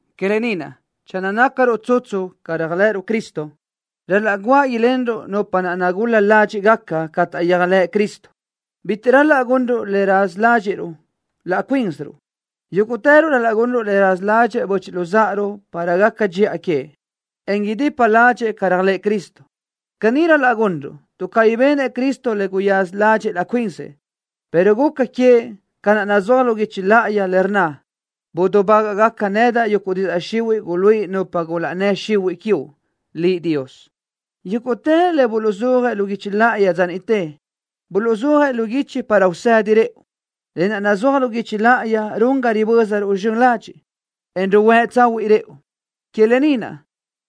Que lë ni naʼ, channö nácaruʼ tsutsu ca réajlëʼëruʼ Cristo, ral-laʼ guáʼ ilenruʼ nupa naʼ nagul-la ládxiʼgaca ca taʼyéajlëʼ Cristo. Bitiʼ ral-laʼ gunruʼ le raza ládxiʼruʼ laʼ cuínsiruʼ. Yúguʼtëruʼ ral-laʼ gunruʼ le raza ládxëʼë böchiʼ luzáʼaruʼ para gaca dxiʼa queëʼ, en idipa ládxëʼë ca réajlëʼë Cristo. Caní ral-laʼ gunruʼ, tuʼ cabí benëʼ Cristo le guyaza ládxëʼë laʼ cuinsëʼ, pero guca queëʼ ca naʼ nazúaj lu guichi láʼayi, le rnna: “Budubágaʼgaca nedaʼ yuguʼ didzaʼ xihuiʼ guluíʼi nupa gulaʼnnë́ xihuiʼ quiuʼ Liʼ, Dios.” Yúguʼtë le buluʼzúajëʼ lu guichi láʼayi dza niʼte, buluʼzúajëʼ lu guichi para usëdi rëʼu. Lë naʼ nazúaj lu guichi láʼayi run ga ribö́zaruʼ zxön ladxiʼ, en ruhuë́ tsahuiʼ rëʼu. Que lë ni naʼ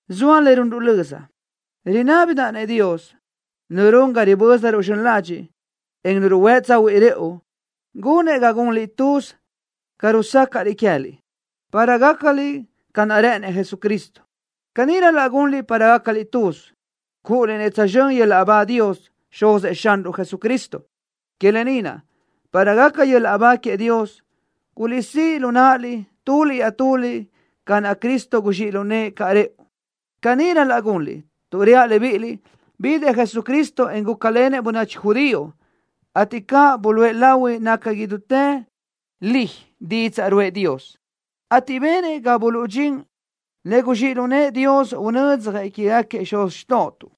zoa le runruʼ löza. Rinábidaʼ-nëʼ Dios, Nu run ga ribö́zaruʼ zxön ladxiʼ, en Nu ruhuë́ tsahuiʼ rëʼu, gunëʼ ga gunliʼ tuz ca rusácaʼliʼ queë́liʼ, para gácaliʼ ca naʼ rë́ʼënëʼ Jesucristo. Caní ral-laʼ gunliʼ para gácaliʼ tuz, cúʼuliʼ-nëʼ tsözxö́n yöl-laʼ ba Dios, Xuzëʼ Xanruʼ Jesucristo. Que lë ni naʼ, para gaca yöl-laʼ ba queëʼ Dios, guliʼsíʼ lu náʼaliʼ tuliʼ iaʼtuliʼ ca naʼ Cristo guzxíʼ lu nëʼë caʼ rëʼu. Caní ral-laʼ gunliʼ, tuʼ reaʼ libíʼiliʼ: Bidëʼ Jesucristo, en gúcalenëʼ bönachi judío, ateʼ caní buluʼe lahui naca idútë li didzaʼ ruʼë Dios, ateʼ benëʼ ga buluʼdxín le guzxíʼ lu nëʼë Dios unödzjëʼ quégaquiëʼ xuz xtóʼotuʼ.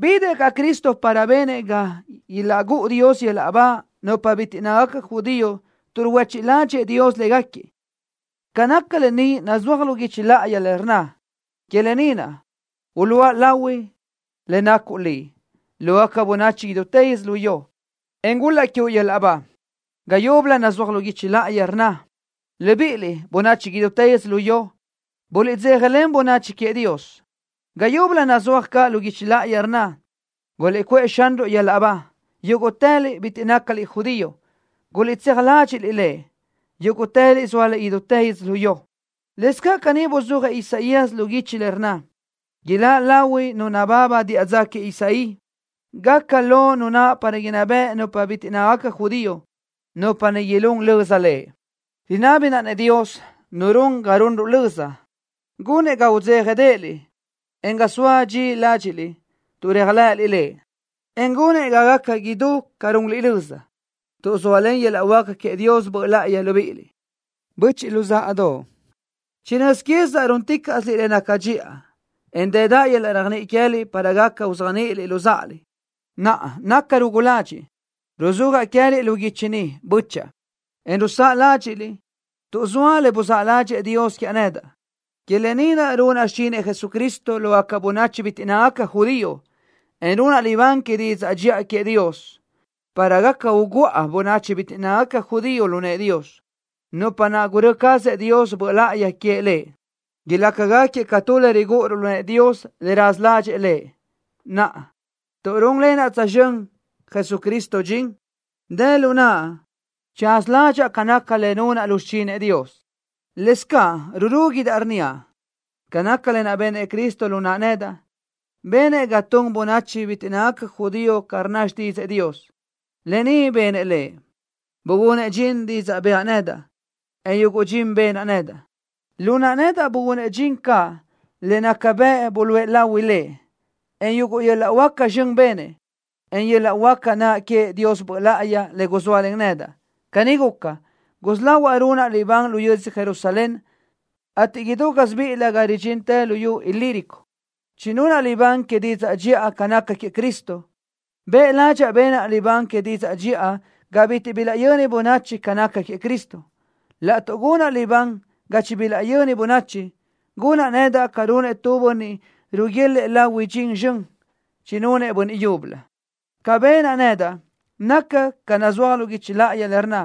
Bidëʼ caʼ Cristo para benëʼ ga ilaʼgúʼu Dios yöl-laʼ ba nupa bitiʼ nácagaca judío tuʼ ruhuéchiʼ ládxëʼë Dios légaquiëʼ. Ca naca lë ni nazúaj lu guichi láʼayi le rnna: Que lë ni naʼ, uluʼa lahui le nacuʼ Liʼ lógaca bönachi idútë yödzölió, en gul-laʼ quiuʼ yöl-laʼ ba. Ga yúbölö nazúaj lu guichi láʼayi le rnna: Libíʼiliʼ, bönachi idútë yödzölió, buliʼdzéjalen bönachi queëʼ Dios. Ga yúbölö nazúaj caʼ lu guichi láʼayi le rnna: Guliʼcuʼë Xanruʼ yöl-laʼ ba, yúguʼtëliʼ bitiʼ nácaliʼ judío. Guliʼtséaj ladxiʼ Lëʼ, yúguʼtëliʼ zóaliʼ idútë yödzölió. Lëscaʼ caní buzúajëʼ Isaías lu guichi le rnna: Iláʼ lahui Nu nababa diʼa dza queëʼ Isaí. Gaca lo Nu naʼ para inná beʼe nupa bitiʼ nácagaca judío. Nupa ni ilún löza Lëʼ. Rinábidaʼ-nëʼ Dios, Nu run ga runruʼ löza, gunëʼ ga udzéjadeʼeliʼ, en ga soa dxi ládxiʼliʼ tuʼ réajlëʼëliʼ Lëʼ, en gunëʼ ga gaca idú ca runliʼ löza, tuʼ zóalen yöl-laʼ huáca queëʼ Dios Böʼ Láʼayi libíʼiliʼ. Böchiʼ luzáʼadoʼ. Chinö́z quézidaʼ rúnticaʼsiliʼ le naca dxiʼa, en dëdaʼ yöl-laʼ réajniʼi queë́liʼ para gaca uzéajniʼiliʼ luzáʼaliʼ. Naʼa nacaʼ rugu ladxiʼ, ruzúajaʼ queë́liʼ lu guichi ni, bö́chaʼa, en rusáʼa ládxiʼliʼ tuʼ zoa le buzáʼ ládxëʼë Dios quiaʼ nedaʼ. Que lë ni naʼ runaʼ xichinëʼ Jesucristo lógaca bönachi bitiʼ nácagaca judío, en runaʼ libán que didzaʼ dxiʼa queëʼ Dios, para gaca uguʼa bönachi bitiʼ nácagaca judío lu nëʼë Dios, nupa naʼ gurö́ cazëʼ Dios Böʼ Láʼayi queëʼ Lëʼ. Ilácagaquiëʼ ca tu le rigúʼuruʼ lu nëʼë Dios, le raza ládxëʼë Lëʼ. Naʼa, tuʼ rúnlenaʼ tsözxö́n Jesucristo dxin, dë lu naʼa tsaza ládxaʼa ca naca le nunaʼ lu xichinëʼ Dios. Lëscaʼ rurúguidaʼ inníaʼ ca naca lë naʼ benëʼ Cristo lu naʼa nedaʼ, benëʼ ga tun bönachi bitiʼ nácagaca judío ca rnna xtídzëʼë Dios. Lë ni benëʼ Lëʼ, bugunëʼ dxin didzaʼ bëʼa nedaʼ, en yuguʼ dxin benaʼ nedaʼ. Lu naʼa nedaʼ bugunëʼ dxin caʼ le nácagaca bëʼ buluʼe lahui Lëʼ, en yuguʼ yöl-laʼ huáca zxön benëʼ, en yöl-laʼ huáca naʼ queëʼ Dios Böʼ Láʼayi le guzóalen nedaʼ. Caní guca, gusí lahuaʼ runaʼ libán lu yödzö Jerusalén, ateʼ idú gásibiʼilö ga ridxintë luyú Ilírico, chinunaʼ libán que didzaʼ dxiʼa ca naca queëʼ Cristo. Bëʼ ládxaʼa benaʼ libán que didzaʼ dxiʼa ga bitiʼ bilaʼyöni bönachi ca naca queëʼ Cristo. Laʼtuʼ gunaʼ libán ga chibilaʼyöni bönachi, gunaʼ nedaʼ ca runëʼ tu bönniʼ ruguélëʼë lahui dxin zxön chinunëʼ bönniʼ yúbölö. Ca benaʼ nedaʼ naca ca naʼ nazúaj lu guichi láʼayi le rnna: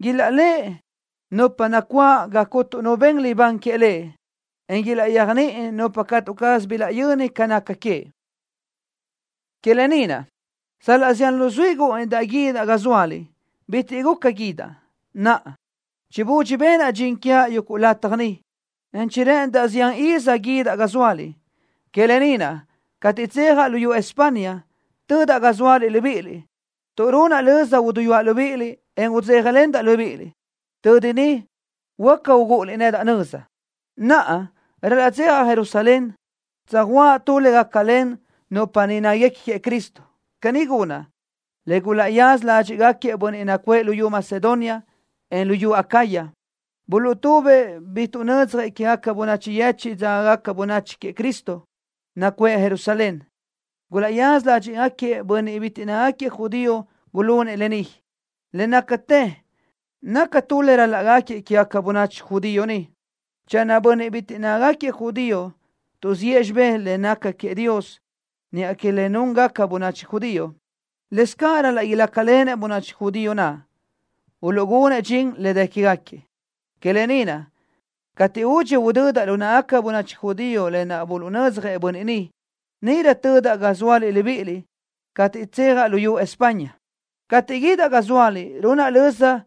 Ilaʼléʼe nupa nacuáʼ ga cuntu nu ben libán queëʼ Lëʼ, en ilaʼyéajniʼi nupa catu caz bilaʼyöni ca naca queëʼ. Que lë ni naʼ, sal-laʼ zián luzuí gúʼunidaʼ guídaʼ ga zóaliʼ, bitiʼ guca guídaʼ. Naʼa, chibudxi benaʼ dxin quiaʼ yuguʼ lataj ni, en chirë́ʼëndaʼ zián iz guídaʼ ga zóaliʼ. Que lë ni naʼ, cateʼ tsejaʼ luyú España, tödaʼ ga zóaliʼ libíʼiliʼ, tuʼ runaʼ löza uduyúaʼ libíʼiliʼ, en udzéjalendaʼ libíʼiliʼ. Tödi niʼ huáca ugúʼuliʼ nedaʼ nöza. Naʼa ral-laʼ tsejaʼ Jerusalén, tsöjuʼa tu le gácalen nupa niʼ néquiguequi queëʼ Cristo. Caní gunaʼ, le gulaʼyaza ládxiʼgaquiëʼ bönniʼ nacuʼë luyú Macedonia, en luyú Acaya, buluʼtubëʼ bi tuʼnödzjëʼ quéguequi bönachi yechiʼ dzágagaca bönachi queëʼ Cristo, nacuʼë Jerusalén. Gulaʼyaza ládxiʼgaquiëʼ bönniʼ bitiʼ nácagaquiëʼ judío gulunëʼ lë ni. Le nácatë naca tu le rál-laʼgaquiëʼ quégaca bönachi judío niʼ. Channö bönniʼ bitiʼ nácagaquiëʼ judío tuʼziʼë xibé le nácagaca queëʼ Dios niʼa que le núngaca bönachi judío, lëscaʼ ral-laʼ ilácalenëʼ bönachi judío naʼ, uluʼgunëʼ dxin le dë quégaquiëʼ. Que lë ni naʼ, cateʼ údxi udödaʼ lu náʼagaca bönachi judío lë naʼ buluʼnödzjëʼ bönniʼ ni, níʼirö tödaʼ ga zóaliʼ libíʼiliʼ cateʼ tsejaʼ luyú España. Cateʼ guídaʼ ga zóaliʼ, runaʼ löza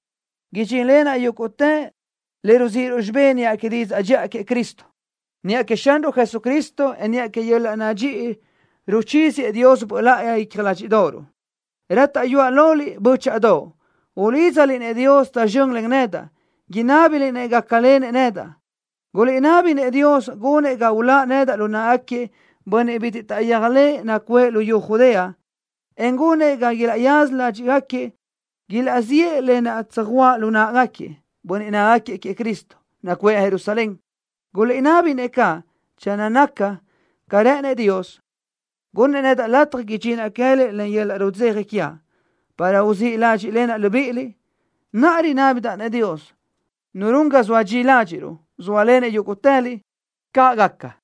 idxínlenaʼ yúguʼtë le ruzíʼiruʼ xibé niʼa que didzaʼ dxiʼa queëʼ Cristo. Niʼa queëʼ Xanruʼ Jesucristo, en niʼa que yöl-laʼ nadxíʼi ruchíziëʼ Dios Böʼ Láʼayi icja ládxiʼdoʼoruʼ, rátaʼyuaʼ loliʼ, bö́chaʼadoʼ, ulídzaliʼ-nëʼ Dios tsözxö́n len nedaʼ, inábiliʼ-nëʼ gácalenëʼ nedaʼ. Guliʼnabi-nëʼ Dios gunëʼ ga uláʼ nedaʼ lu náʼagaquiëʼ bönniʼ bitiʼ taʼyéajlëʼë nacuʼë luyú Judea, en gunëʼ ga ilaʼyaza ládxiʼgaquiëʼ ilaʼziʼë lë naʼ tsöjuʼa lu náʼagaquiëʼ bönniʼ nácagaquiëʼ queëʼ Cristo, nacuʼë Jerusalén. Guliʼnabi-nëʼ caʼ, channö naca ca rë́ʼënëʼ Dios, gunnëʼ nedaʼ lataj idxinaʼ queë́liʼ len yöl-laʼ rudzeja quiaʼ, para uzíʼ ládxiʼlenaʼ libíʼiliʼ. Naʼa rinábidaʼ-nëʼ Dios, Nu run ga zoa dxi ládxiʼruʼ, sóalenëʼ yúguʼtëliʼ. ¡Caʼ gaca!